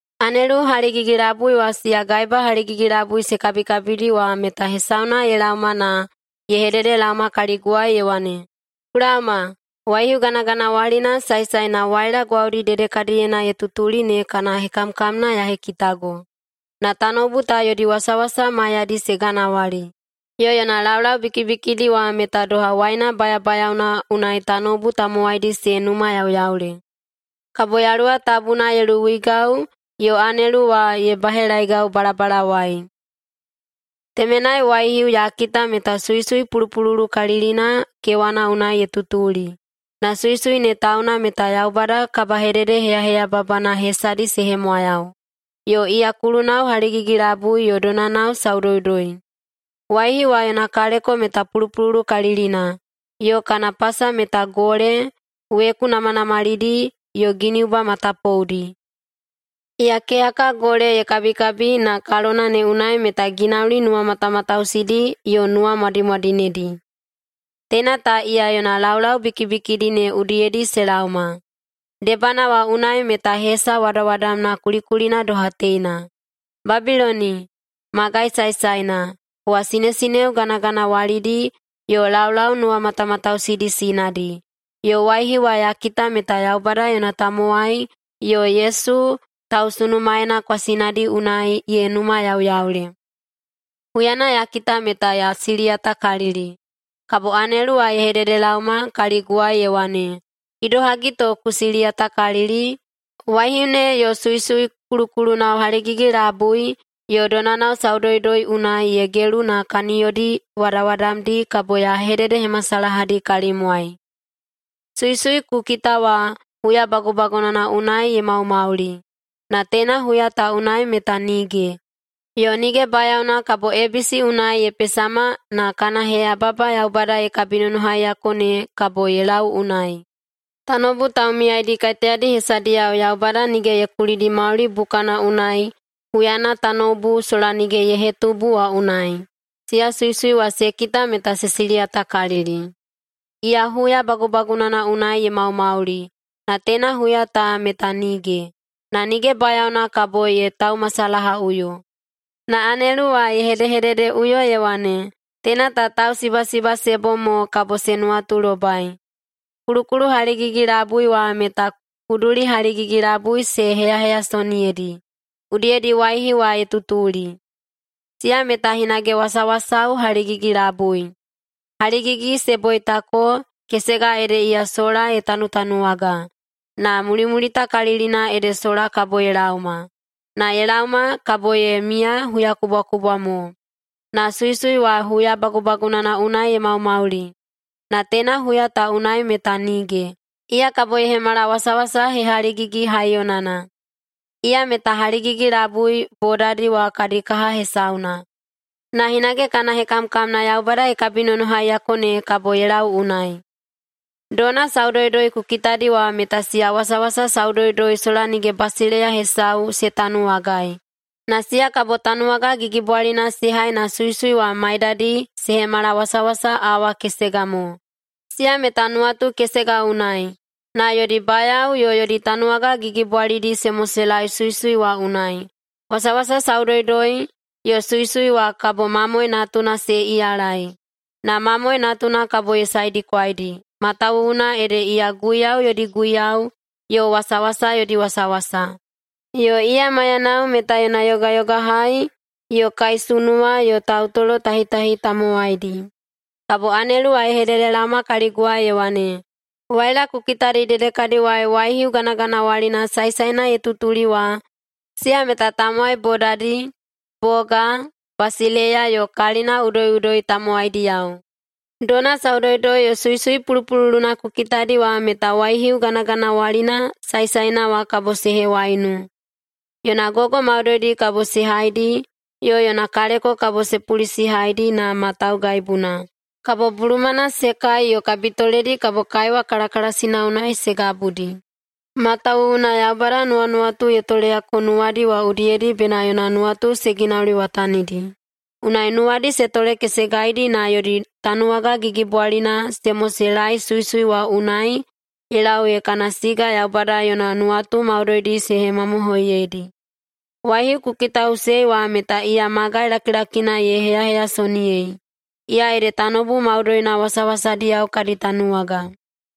Anelu haligigi-labui wa siya gaeba haligigi-labui se kabikabidi wa meta hesauna ye laoma na ye hededelaoma kaliguwai ye wane, “Ku laoma, waihiu ganaganawalina saesaena waila gwaudi dedekadiyena ye tutuli ne kana hekamkamna ya hekitago. Na tanoubu ta yodi wasawasa maiyadi se ganawali, yo yona laulau bikibikidi wa meta doha waina bayabayaona unai tanoubu tamowaidi se numayauyaule.” Kabo Yaluwa Tabuna ye luwuigau yo anelu wa ye bahelaeigau balabalawai. Temenai waihiu ya kita meta suisui pulupululukalilina kewana unai ye tutuli. Na suisui ne tauna meta Yaubada kabahededeheyaheyababana hesadi se hemwayau, yo iya kulunao haligigi-labui yo donanao saudoudoi. Waihiu wa yona kaleko meta pulupululukalilina, yo kana pasa meta gole, weku namanamalidi yo giniuba matapoudi. Iya keyaka gole ye kabikabi na kalona ne unai meta ginauli nuwamatamatausidi yo nuwamwadimwadinedi. Teina ta iya yona laulau bikibikidi ne udiyedi se laoma. Debana wa unai meta hesa wadawadamna kulikulina doha teina: “Babiloni, magai saesaena, kowa sinesineo ganaganawalidi yo laulau nuwamatamatausidi sinadi.” Yo waihiu wa ya kita meta Yaubada yona tamowai yo Yesu tausunumaena kwasinadi unai ye numayauyaule. Huyana ya kita meta ya siliyatakalili. Kabo anelu wa ye hededelaoma kaliguwai ye wane, “Idohagi to ku siliyatakalili? Waihiu ne yo suisui kulukulunao haligigi-labui yo donanao saudoudoi unai ye gelu ne kaniyodi wadawadamdi kabo ya hededehemasalahadi kalimwai. Suisui ku kita wa, huya bagubagunana unai ye maumauli, na teina huya ta unai meta nige, yo nige bayaona kabo ebisi unai ye pesama na kana heyababa Yaubada ye kabinonohaiyako ne kabo ye lau unai. Tanoubu taumiyaidi kaiteyadi hesadiyao Yaubada nige ye kulidi mauli bukana unai huyana tanoubu sola nige ye hetubu wa unai, siya suisui wa se kita meta se siliyatakalili. Iya huya bagubagunana unai ye maumauli, na teina huya ta meta nige, na nige bayaona kabo ye taumasalahaꞌuyo.” Na anelu wa ye hedehededeꞌuyo ye wane, “Teina ta tausibasiba se bom mo kabo se nuwatulobai: Kulukulu haligigi-labui wa meta kuduli haligigi-labui se heyaheyasoniyedi, udiyedi waihiu wa ye tutuli. Siya meta hinage wasawasao haligigi-labui: haligigi se boitako, kesega ede iya sola ye tanutanuwaga, na mulimulitakalilina ede sola kabo ye laoma. Na ye laoma, kabo ye miya huyakubwakubwa mo. Na suisui wa huya bagubagunana unai ye maumauli, na teina huya ta unai meta nige, iya kabo ye hemala wasawasa hehaligigi-haiyonana. Iya meta haligigi-labui bodadi wa kadi kaha hesauna, na hinage kana hekamkamna Yaubada ye kabinonohaiyako ne kabo ye lau unai. Dona saudoudoi ku kitadi wa meta siya wasawasa saudoudoi sola nige basileiya hesau se tanuwagai. Na siya kabo tanuwaga gigibwalina se hai na suisui wa maidadi se hemala wasawasa awa kesega mo. Siya meta nuwatu kesega unai, na yodi bayao yo yodi tanuwaga gigibwalidi se moseilaei suisui wa unai. Wasawasa saudoudoi yo suisui wa kabo Mamoe Natuna se iyalai, na Mamoe Natuna kabo ye saedikwaidi, matawuwuna ede iya guiyau yodi Guiyau yo wasawasa yodi Wasawasa. Yo iya maiyanao meta yona yogayogahai yo kaisunuwa yo tautolotahitahi tamowaidi.” Kabo anelu wa ye hededelaoma kaliguwai ye wane, “Waila ku kitadi dedekadiwai waihiu ganaganawalina saesaena ye tutuli wa, siya meta tamowai bodadi, boga, basileiya yo kalina udoiꞌudoi tamowaidiyao. Dona saudoudoi yo suisui pulupululuna ku kitadi wa meta waihiu ganaganawalina saesaena wa kabo se hewaiunu. Yona gogo maudoidi kabo se haidi, yo yona kaleko kabo se pulisihaidi na ma taugaibuna. Kabo bulumana se kai yo kabitoledi kabo kaiwa kalakalasina unai se gabudi. Matawuwuna Yaubada nuwanuwatu ye toleyako nuwadi wa udiyedi bena yona nuwatu se ginauliwatanidi. Unai nuwadi se tolekesegaidi na yodi tanuwaga gigibwalina se moseilaei suisui wa unai ye lau ee kana siga Yaubada yona nuwatu maudoidi se hemamohoiyedi. Waihiu ku kitaꞌusei wa meta iya magai lakilakina ye heyaheyasoniyei, iya ede tanoubu maudoina wasawasadiyao kadi tanuwaga.”